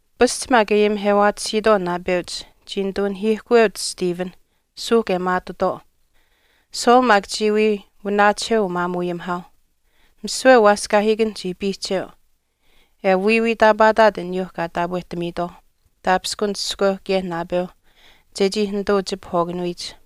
Pasch maak e ayimihewaatisiitwaau naapeuch chii nituu nahiihkuweuch Stephen, suuhk e maatutwaau. Saul maak chii wii wanaachiheu umaamuuayimihaauh. Misiwe waaskaahiikan chii piihcheu, e wiiwiitaapaataat aniyuu kaa taapwehtamiitwaau, taapishkun iskweu kaye naapeu, chechii nituu chipahwaakanuyich.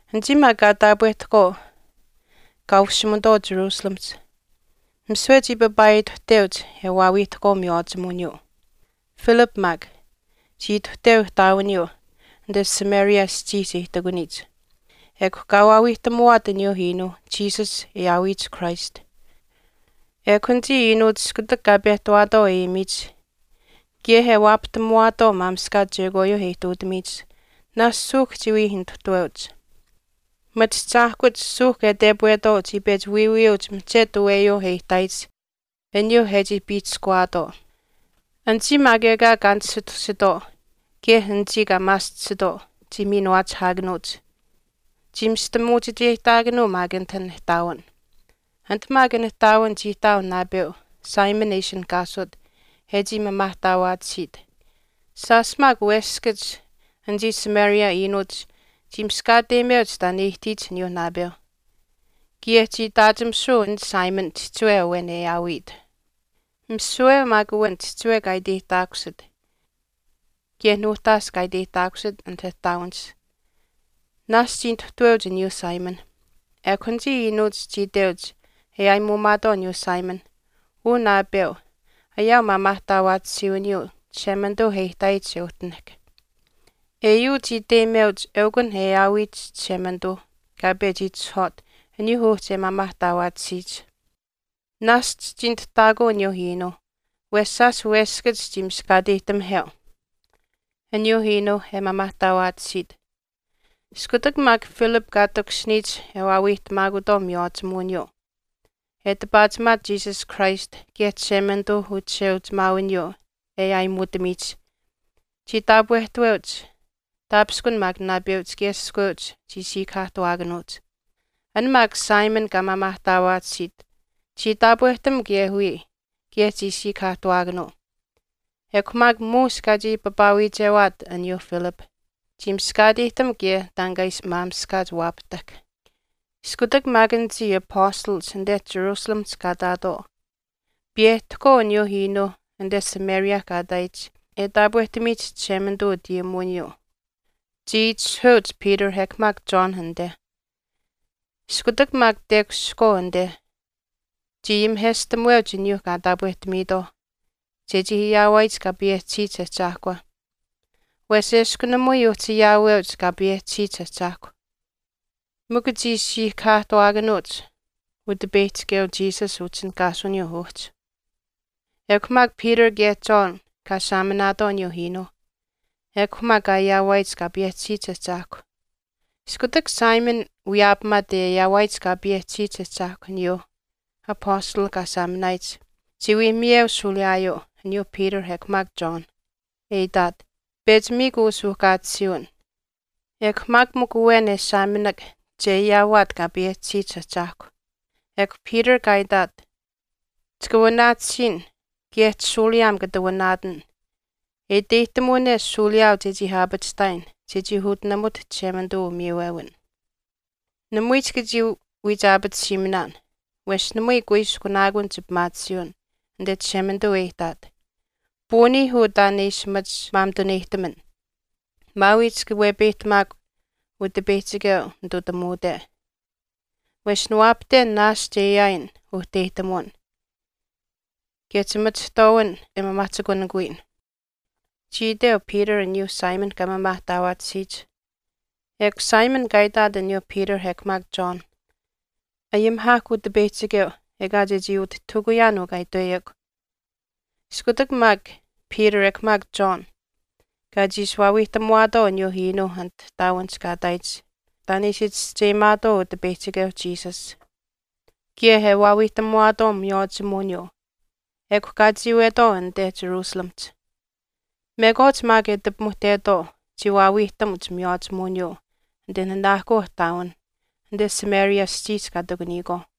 Anichii maak kaa taapwehtahkwaau kaa ushimutwaau Jerusalemihch, misiwe chii papaaituhteuch e waawiihtahkwaau miywaachimuwiniyuu. Philip maak, chii ituhteu ihtaawiniyuu anite Samaria aschiihch e ihtakuniyich. Ekw kaa waawiihtamuwaat aniyuu iinuu, Jesus, e aawiyich Christ. Ekw anichii iinuuch iskutak kaa pehtawaatwaau e ayimiyich kaye e waapahtamuwaatwaau maamishkaach chekwaayuu e ihtuutamiyich naashch suuhk chii wii nituhtaweuch. Machiahchaahkuch suuhk e tepwetwaau chii pechi wiiwiyuuch mihchetu aweyuu e ihtaayich aniyuu e chii piihchishkuwaatwaau. Anichii maak ekaa kaa nisitusitwaau, kaye anichii kaa maaschisitwaau, chii miinuwaachihaakanuuch. Chii mistamuuchicheyihtaakanuu maak anit an ihtaawin. Anit maak an ihtaawin chii ihtaau naapeu Simon e ishinihkaasut e chii maamaahtaawaatisiit. Shaash maak weshkachiishiish anichii Samaria iinuuch chii miskaateyimeuch taan e ihtiyich aniyuu naapeu. Kaye chii itaachimisuu an Simon chihchiwe awen e aawit. Misiwe maak awen chihchiwe kaa iteyihtaakusit kaye nuuhtaash kaa iteyihtaakusit anit ihtaawinihch naashch chii nituhtaweuch aniyuu Simon, ekw anichii iinuuch chii iteuch e aayimuumaatwaau aniyuu Simon, “Uu naapeu, ayaau maamaahtaawaatisiiwiniyuu Chishemanituu e ihtaayich e uhtinahk. Eyuu chii iteyimeuch eukun e aawiyich Chishemanituu kaa pechi itishahwaat aniyuu uhchi e maamaahtaawaatisiyich.” Naashch chii nituhtaakuu aniyuu iinuuh wesh shaash weskach chii miskaateyihtamiheu aniyuuh iinuuh e maamaahtaawaatisiit. Iskutak maak Philip kaa takushiniyich e waawiihtamaakutwaau miywaachimuwiniyuu, e tipaachimaat Jesus Christ kaye Chishemanituu uchisheuchimaawiniyuu e aayimuutamiyich, chii taapwehtaweuch, taapishkun maak naapeuch kaye iskweuch chii siikahaahtuwaakanuuch. An maak Simon kaa maamaahtaawaatisiit chii taapwehtam kaye wiya kaye chii siikahaahtuwaakanuu. Ekw maak muush kaachii papaawiichewaat aniyuu Philip, chii miskaateyihtam kaye taan kaa ishi maamishkaach waapahtahk. Iskutak maak anichii apastalach anite Jerusalemihch kaa ihtaatwaau, piyehtahkwaau aniyuu iinuu anite Samaria kaa ihtaayich e taapwehtamiyich Chishemanituu utayimuwiniyuu, chii itishahuweuch Peter ekw maak John anite. Iskutak maak tekushihkwaau anite, chii ayimiheshtamuweuch aniyuu kaa taapwehtamiitwaauh chechii ayaawaayich Kaa payehchisiyich Ahchaahkwa. Wesh eshkw namui uhchi ayaaweuch Kaa payehchisiyich Ahchaahkwa. Mikw chii siikahaahtuwaakanuuch Utipeyihchikeu Jesus utishinihkaasuwiniyuu uhchi. Ekw maak Peter kaye John kaa saaminaatwaau aniyuu iinuuh, ekw maak kaa ayaawaayich Kaa payehchisiyich Ahchaahkwa. Iskutak Simon wiyaapamaat e ayaawaayich Kaa payehchisiyich Ahchaahkwa aniyuu apastalh kaa saaminaayich, chii wii miyeu shuuliyaayuu aniyuu Peter ekw maak John, e itaat, “Pechi miikw uu suuhkaatisiiwin, ekw maak mikw awen e saaminak che ayaawaat Kaa payehchisiyich Ahchaahkwa.” Ekw Peter kaa itaat, “Chika wanaatisiin kaye chishuuliyaam kata wanaatan e iteyihtamuwane shuuliyaau chechii aapachihtaayin chechii utinamut Chishemanituu umiiwewin. Namui chika chii wiichaapatisiiminaan, wesh namui kuiskunaakun chipimaatisiiwin anite Chishemanituu e ihtaat. Puuniih uu taan e ishi machi maamituneyihtaman, maawii chika wepeyihtamaakw Utipeyihchikeu nitutamuute. Wesh niwaapahten naashch e ayaayin uhteyihtamuwin, kaye chimachihtwaawin e maamaahchikunikuyin,” chii iteu Peter aniyuu Simon kaa maamaahtaawaatisiyich. Ekw Simon kaa itaat aniyuu Peter ekw maak John, “Ayimihaahkw Utipeyihchikeu ekaa chechii utihtahukuyaan uu kaa itweyekw.” Iskutak maak Peter ekw maak John kaa chiishi waawiihtamuwaatwaau aniyuuh iinuuh anit ihtaawinihch kaa ihtaayich taan e ishi chischeyimaatwaau Utipeyihchikeu Jesus, kaye e waawiihtamuwaatwaau miywaachimuwiniyuu ekw kaa chiiwetwaau anite Jerusalemihch. Mekwaach maak e ati pimuhtetwaau chii waawiihtamuch miywaachimuwiniyuu anite nanaahkuu ihtaawinh anite Samaria aschiihch kaa ihtakuniyikwaauh.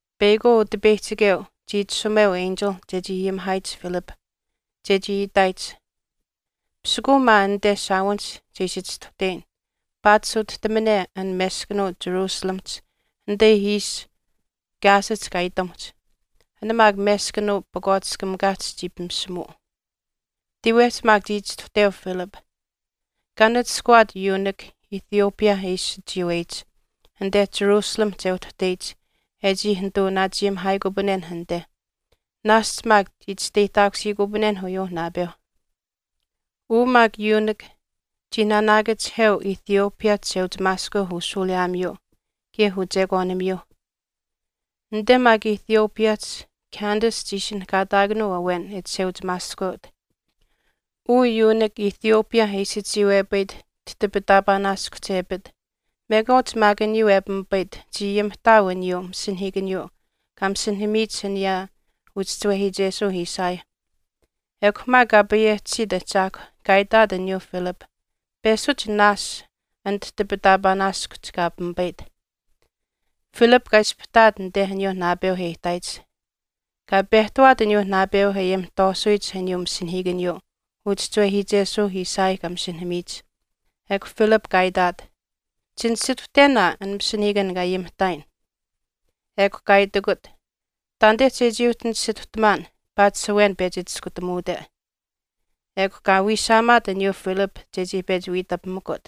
Peyakwaau Utipeyihchikeu chii itashumeu enchil chechii ayimihaayich Philip, chechii itaayich, pisikuuh maa anite shaawinihch che ishi chistuhteyin paatish utihtamane an meskanuu Jerusalemihch anite ishi Gazahch kaa itamuhch. An maak meskanuu pakwaatiskamikaahch chii pimishimuu. Tiiwehch maak chii chistuhteu Philip, kaa nachishkawaat yuunik Ethiopia e ishi chiiweyich, anite jerusalemihch e uhtuhteyich e chii nituu naachayimihaaikupanen anite, naashch maak chii chisteyihtaakusiikupanen uyuu naapeu. Uu maak yuunik chii naanaakachihtaaweu Ethiopia chisheuchimaaskweu ushuuliyaamiyuu kaye uchekwaanimiyuu. Anite maak Ethiopiahch Candace chii ishinihkaataakanuu awen e chisheuchimaaskweut. Uu yuunik Ethiopia e ishi chiiwepayit tihtipitaapaanaaskuhch e apit, mekwaach maak aniyuu e pimipayit chii ayimihtaau aniyuu masinahiikaniyuu kaa masinahamiyich aniyaa uchischiwehiichesuu Isaiah. Ekw maak Kaa payehchisiyich Ahchaahkw kaa itaat aniyuu Philip, “Peshuch naash an tihtipitaapaanaaskuhch kaa pimipayit.” Philip kaa ispahtaat anite aniyuu naapeu e ihtaayich. Kaa pehtawaat aniyuu naapeu e ayimihtwaasuyich aniyuu masinahiikaniyuu uchischiwehiichesuuh Isaiah kaa masinahamiyich. Ekw Philip kaa itaat, “Chinisituhten aa an masinahiikan kaa ayimihtaayin.” Ekw kaa itikut, “Ttaanite chechii uhchi nisituhtamaan paatish awen pechi chiskutamuute.” Ekw kaa wiishaamaat aniyuu Philip chechii pechi wiitapimikut.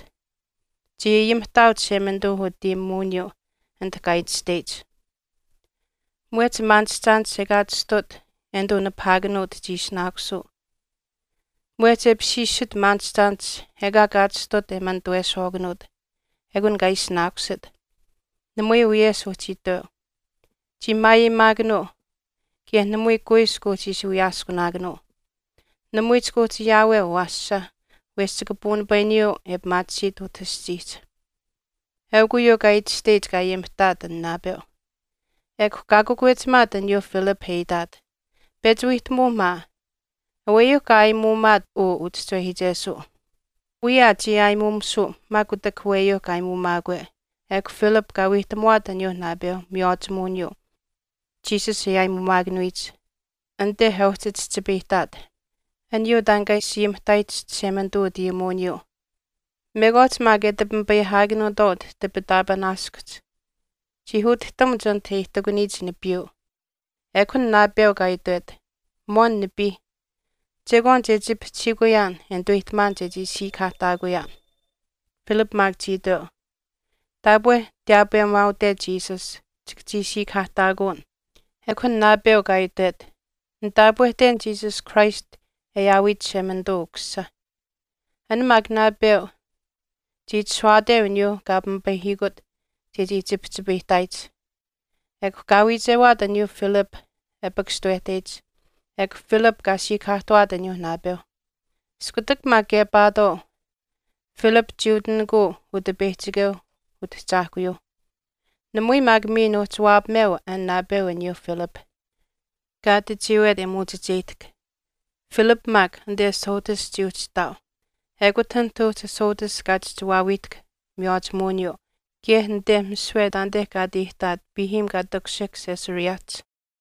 Chii ayimihtaau Chishemanituu utayimuwiniyuu anit kaa itashteyich, Mwehch maanishchaanish ekaa chistut e nituu nipahaakanuut chii ishinaakusuu, mwehch e apishiishit maanishchaanish ekaa kaa chistut e manituweshwaakanuut, ekun kaa ishinaakusit, namui wiyesh uhchi itweu. Chii maayeyimaakanuu, kaye namui kuiskw uhchi ishi wiyaaskunaakanuu. Namui chika uhchi ayaaweu awaasha wesh chika puunipayuu e pimaatisiit utah aschiihch. Eukw uyuu kaa itashteyich kaa ayimihtaat an naapeu. Ekw kaa kakwechimaat aniyuu Philip e itaat, “Pechi wiihtamuu maa, aweyuu kaa aayimuumaat uu uchischiwehiichesuu, wiya aa chii aayimuumisuu maak kutak aweyuu kaa aayimuumaakwe.” Ekw Philip kaa wiihtamuwaat aniyuu naapeu miywaachimuwiniyuu Jesus e aayimuumakanuyich, anite e uhchi chihchipayihtaat aniyuu taan kaa ishi ayimihtaayich Chishemanituu utayimuwiniyuu. Mekwaach maak e ati pimipayihaakanuutwaau tihtipitaapaanaaskuhch chii utihtamuch anit e ihtakuniyich nipiiyuu, ekw an naapeu kaa itwet, “Mwaan nipii, chekwaan che chipihchihiikuyaan e nituweyihtamaan chechii siikahaahtaakuyaan.” Philip maak chii iteu, “Taapwe tiyaapweyimaaute Jesus, chika chii siikahaahtaakuun.” Ekw an naapeu kaa itwet, “Nitaapwehten Jesus Christ e aawit Chishemanituu Ukusisa.” An maak naapeu chii itashuwaateu aniyuuh kaa pimipayihiikut chechii chipihchipayihtaayich. Ekw kaa wiichewaat aniyuu Philip e pakashtawehteyich. Ekw Philip kaa siikahaahtuwaat aniyuu naapeu. Iskutak maak kepaatwaau, Philip chii utinikuu Utipeyihchikeu Utahchaahkuyuu. Namui maak miin uhchi waapameu an naapeu aniyuu Philip, kaa ati chiiwet, e muuchicheyihtahk. Philip maak anite Azotus chii uhchi ihtaau. Ekut anit uhchi Azotus kaa chihchi waawiihtahk miywaachimuwiniyuu kaye anite misiwe taanite kaa ati ihtaat piihiim kaa takushihk Caesareahch.